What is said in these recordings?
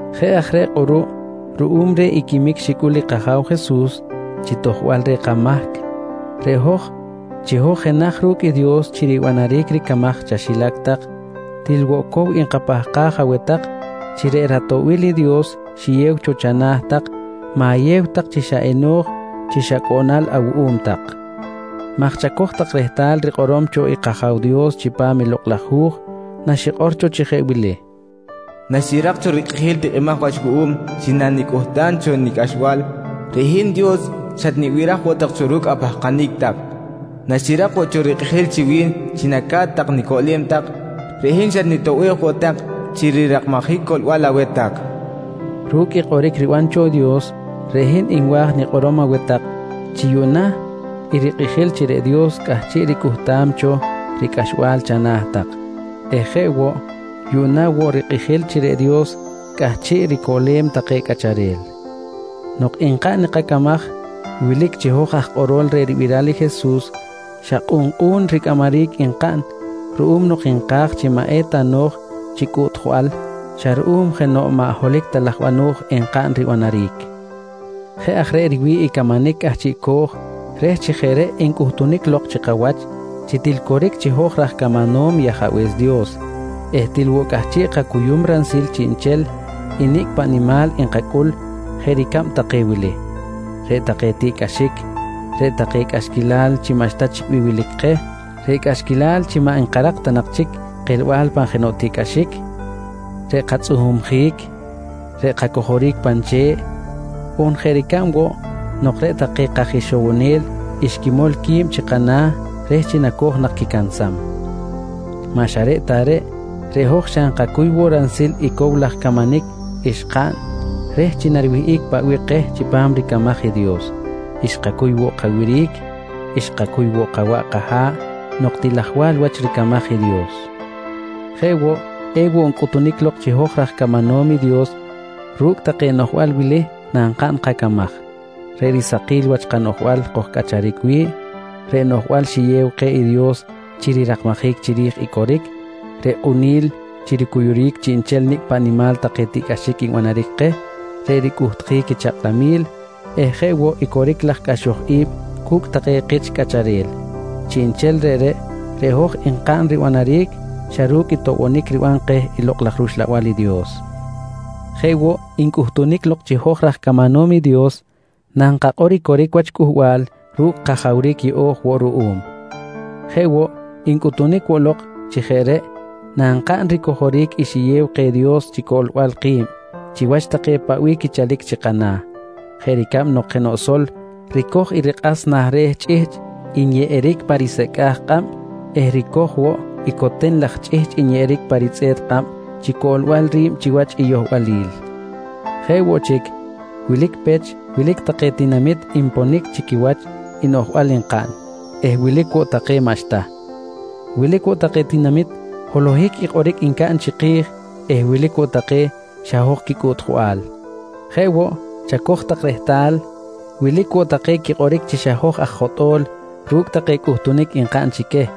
Jeꞌ aj reꞌ kꞌuruꞌ ruꞌum reh i quimic xicꞌul i kAja̱w Jesus chi tojbal reh kamahc reꞌ hoj, chi hoj jenaj ru̱cꞌ i Dios chi ribanaric ricamaj chaxilac tak, til cow nkapahkaj aweh tak chi reꞌ ratoꞌbil i Dios xiyew cho chana̱ tak ma̱yew tak chi xa eno̱j chi xa cꞌoꞌnal awuꞌum tak maj chacoj tak rehtal rikꞌorom cho i kAja̱w Dios chipam i Lokꞌ laj Hu̱j naxikꞌor cho chi jeꞌ wili: “Naxirak cho rikꞌijil tikꞌimaj wach wuꞌum chi nanicꞌuhtam cho nicꞌaxbal, reꞌ hin Dios xatnibiraj woꞌ tak cho ru̱cꞌ apahkanic tak. Naxirak woꞌ cho rikꞌijil chi wi̱n chi naca̱t tak nicoꞌlem tak, reꞌ hin xatnitoꞌbej woꞌ tak chi rirakmajic coꞌlbal aweh tak, nqui xikꞌor cho. Ru̱cꞌ i kꞌoric ribanam cho i Dios reꞌ hin nwa̱j nikꞌorom aweh tak chi yuꞌna i rikꞌijil chi reꞌ Dios cꞌahchiꞌ ricꞌuhtam cho ricꞌaxbal chana̱ tak eh jeꞌ woꞌ yuꞌna woꞌ rikꞌijil chi reꞌ Dios cꞌahchiꞌ ricoꞌlem take cꞌacharel. Nok nkaꞌn i kacamaj wilic chi hoj aj kꞌorol reh ribiral i Jesus xa kꞌunkꞌu̱n ricꞌamaric nkaꞌn ruꞌum nok nka̱j chi maꞌ eta no̱j chi cꞌuꞌtjbal xa ruꞌum jenoꞌ maꞌ holohic ta laj bano̱j enkaꞌn ribanaric. Jeꞌ aj reꞌ riwi̱ꞌ i camanic cꞌahchiꞌco̱j reh chi jeꞌ reꞌ encꞌutunic lok chi kawach chi til coric chi hoj raj camanom i Ajabe̱s Dios eh til woꞌ cꞌahchiꞌ kacuyum ransil chiꞌnchel i nicꞌ paꞌ nimal nkacꞌul jeꞌ ricab take wili: Reꞌ take tiꞌcꞌaxic, reꞌ take cꞌaxquilal chi maꞌxta chic bih wilic keh, reꞌ cꞌaxquilal chi maꞌ nkarak ta nak chic kelbal pan jenoꞌ cꞌaxic, reꞌ katzꞌuhumjic, reꞌ kacojoric pan che̱ꞌ, on jeꞌ ricab woꞌ nok reꞌ take kaj ixowonel xquimol qui̱b chi kana̱ reh chi nacoj nak quicansam. Maꞌ xa reꞌ ta reꞌ, reꞌ hoj xa nkacuy woꞌ ransil i cow laj camanic xkaꞌn reh chi nariwihꞌic paꞌ bih keh chipam ricamaj i Dios, xkacuy woꞌ kawiric, xkacuy woꞌ kawaꞌ kaha̱ꞌ nok til ajwal wach ricamaj i Dios. Jeꞌ woꞌ ewoꞌ ncꞌuhtunic lok chi raj camanom i Dios ru̱cꞌ take noꞌjbal wili nankaꞌn kacamaj: Reꞌ risakil wach noꞌjbal kojcꞌacharic wi̱ꞌ, reꞌ noꞌjbal xiyew keh i Dios chi rirakmajic chiri̱j i coric, reꞌ kꞌuni̱l chi ricuyuric chiꞌnchel nicꞌ paꞌ nimal take tiꞌcꞌaxic nbanaric keh, reꞌ ricꞌuhtjic i chakꞌlamil eh jeꞌ woꞌ i coric laj cꞌaxoj i̱b cu̱cꞌ take kich cꞌacharel. Chiꞌnchel reꞌreꞌ, reꞌ hoj nkaꞌn ribanaric xa ru̱cꞌ i toꞌbonic riban keh i Lokꞌ laj rUxlabal i Dios. Jeꞌ woꞌ ncꞌutunic lok chi hoj raj camanom i Dios nankakꞌor i coric wach cꞌuhbal ru̱cꞌ kajawric yeꞌo̱j woꞌ ruꞌum. Jeꞌ woꞌ, ncꞌutunic woꞌ lok chi jeꞌ reꞌ nankaꞌn ricojoric i xiyew keh i Dios chi coꞌlbal ki̱b chiwach take paꞌ bih quichalic chi kana̱ jeꞌ ricab nok jenoꞌ sol ricoj i rikꞌas nah re̱ chꞌihchꞌ nyeꞌeric pan risecꞌa̱j kꞌab eh ricoj woꞌ i coten laj chꞌihchꞌ nyeꞌeric pa ritzꞌe̱t kꞌab chi coꞌlbal ri̱b chiwach i yohbalil. Jeꞌ woꞌ chic, wilic pech wilic take tinamit nponic chi quiwach i noꞌjbal nkaꞌn eh wilic woꞌ take maꞌxta. Wilic woꞌ take tinamit holohic i kꞌoric ncaꞌn chiki̱j eh wilic woꞌ take xa hoj quicꞌuꞌtjbal. Jeꞌ woꞌ chacoj tak rehtal, wilic woꞌ take quikꞌoric chi xa hoj aj jotꞌo̱l ru̱cꞌ take cꞌuhtunic nkaꞌn chi queh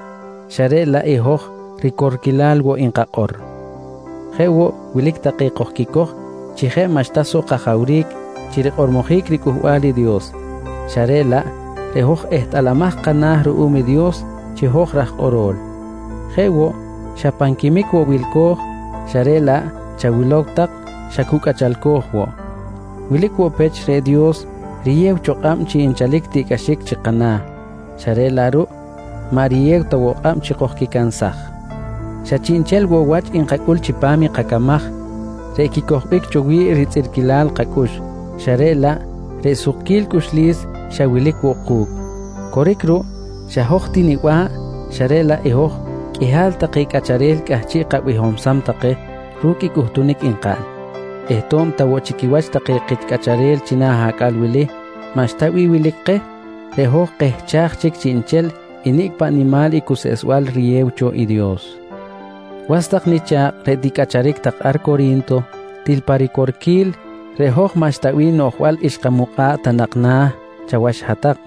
xa reꞌ laꞌ i hoj ricorquilal woꞌ nkakꞌor. Jeꞌ woꞌ wilic take kojquicoj chi jeꞌ maꞌxta soꞌ kajawric chi rikꞌormojic riCꞌuhbal i Dios xa reꞌ laꞌ reꞌ hoj ehtꞌalamaj kana̱ ruꞌum i Dios chi hoj raj kꞌoro̱l. Jeꞌ woꞌ xa pan quimic woꞌ wilco̱j xa reꞌ laꞌ chawilow tak, xa cu cꞌachalco̱j woꞌ. Wilic woꞌ pech reꞌ Dios riyew cho kꞌab chi nchalic i tiꞌcꞌaxic chi kana̱ xa reꞌ laꞌ ruꞌ maꞌ riyew ta woꞌ kꞌab chi kojquicansaj. Xa chiꞌnchel woꞌ wach nkacꞌul chipam i kacamaj reꞌ quicojbic cho wi̱ꞌ ritzꞌirquilal kacꞌux xa reꞌ laꞌ reꞌ sukquil cꞌuxlis xa wilic woꞌ ku̱cꞌ. Coric ruꞌ, xa hoj ti niba̱ꞌ xa reꞌ laꞌ i hoj qꞌuihal take cꞌacharel cꞌahchiꞌ kabihomsam take ru̱cꞌ i cꞌuhtunic nkaꞌn eh to̱b ta chi quiwach take kich cꞌacharel china̱ acꞌal wili maꞌxta bih wilic keh, reꞌ hoj kehchaj chic chiꞌnchel i nicꞌ paꞌ nimal i cuseꞌsbal riyew cho i Dios. Yuꞌna was nicha̱kꞌ reꞌ ticꞌacharic tak ar Cori̱nto til pa ricorquil reꞌ hoj maꞌxta bih noꞌjbal xkamukꞌa̱ꞌ ta nak na̱ chawach hat-tak,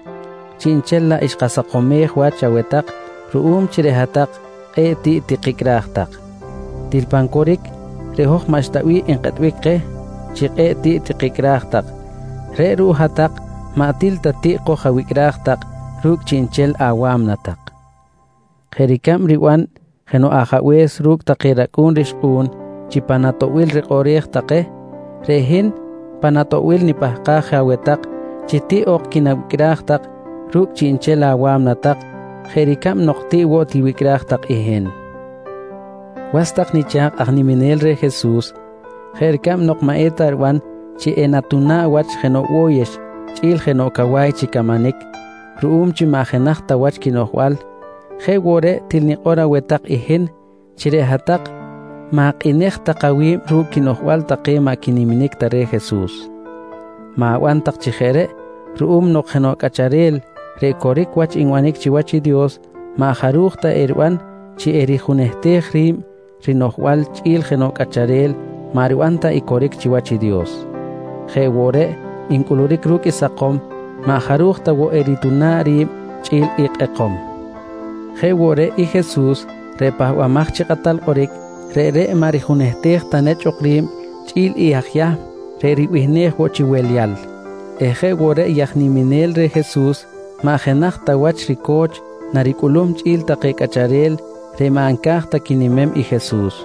chiꞌnchel laꞌ xkasakomej wach aweh tak ruꞌum chi reꞌ hat-tak kꞌe̱ꞌ tiꞌ tikicꞌraj tak. Til pan coric, reꞌ hoj maꞌxta bih nkꞌetbic keh chi til kꞌe̱ꞌ tiꞌ tikicꞌraj tak reꞌ ruꞌ hat-tak maꞌ til ta tiꞌ koj-awicꞌraj tak ru̱cꞌ chiꞌnchel awa̱mna tak. Jeꞌ ricab riban jenoꞌ ajabe̱s ru̱cꞌ take racꞌu̱n rixkꞌu̱n chi pan atoꞌbil rikꞌoꞌrej take, reꞌ hin pan atoꞌbil nipahkaj je aweh tak chi tiꞌ ok quinawicꞌraj tak ru̱cꞌ chiꞌnchel awa̱mna tak jeꞌ ricab nok tiꞌ woꞌ tiwicꞌraj tak i hin. Was tak nicha̱kꞌ aj niminel reh Jesus, jeꞌ ricab nok maꞌ eta riban chi enatuna̱ꞌ wach jenaj bo̱yex chꞌi̱l jenoꞌ cawa̱y chi camanic ruꞌum chi maꞌ jenaj ta wach quinoꞌjbal jeꞌ woꞌ reꞌ til nikꞌor aweh tak i hin chi reꞌ hat-tak ma̱kꞌinej tak awi̱b ru̱cꞌ quinoꞌjbal take maꞌ quiniminic ta reh Jesus. Ma̱ban tak chi jeꞌ reꞌ ruꞌum nok jenoꞌ cꞌacharel reꞌ coric wach nbanic chiwach i Dios maꞌ jaruj ta eriban chi erijunehtej ri̱b rinoꞌjbal chꞌi̱l jenoꞌ cꞌacharel maꞌ riban ta i coric chiwach i Dios. Jeꞌ woꞌ reꞌ ncꞌuluric ru̱cꞌ i sakom, maꞌ jaruj ta woꞌ erituna̱ꞌ ri̱b chꞌi̱l i kꞌekom. Jeꞌ woꞌ reꞌ i Jesus reꞌ Pahbamaj chi Kꞌatal Kꞌoric, reꞌreꞌ maꞌ rijunehtej ta nechꞌ ok ri̱b chꞌi̱l i aj Yahm reꞌ ribihnej woꞌ chi Welyal eh jeꞌ woꞌ reꞌ i aj niminel reh Jesus maꞌ jenaj ta wach rico̱ch naricꞌulum chꞌi̱l take cꞌacharel reꞌ maꞌ nca̱j ta quinimem i Jesus.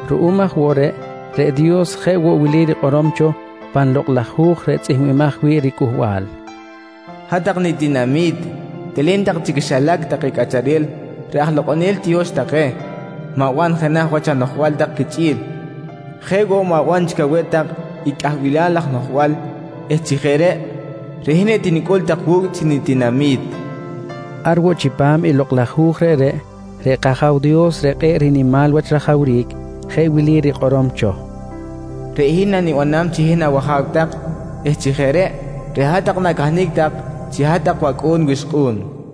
Ruꞌum aj woꞌ reꞌ, reꞌ Dios jeꞌ woꞌ wili rikꞌorom cho pan Lokꞌ laj Hu̱j reꞌ tzꞌihmbimaj wi̱ꞌ riCꞌuhbal: “Hat-tak nitinami̱t, telen tak chi quixilac take cꞌacharel reꞌ aj lokꞌonel tiyo̱x take, ma̱ban jenaj wach anoꞌjbal tak quichꞌi̱l. Jeꞌ woꞌ ma̱ban chic aweh tak i cꞌahbilal laj noꞌjbal eh chi jeꞌ reꞌ, reꞌ hin etinicꞌul tak wu̱cꞌ chi nitinami̱t, nqui rikꞌorom. Ar woꞌ chipam i Lokꞌ laj Hu̱j reꞌreꞌ, reꞌ kAja̱w Dios reꞌ kꞌe̱ꞌ rinimal wach rajawric jeꞌ wili rikꞌorom cho: “Reꞌ hin nanibanam chi hin awAja̱w tak eh chi jeꞌ reꞌ, reꞌ hat-tak na̱cahnic tak chi hat-tak wacꞌu̱n wixkꞌu̱n, nqui rikꞌorom.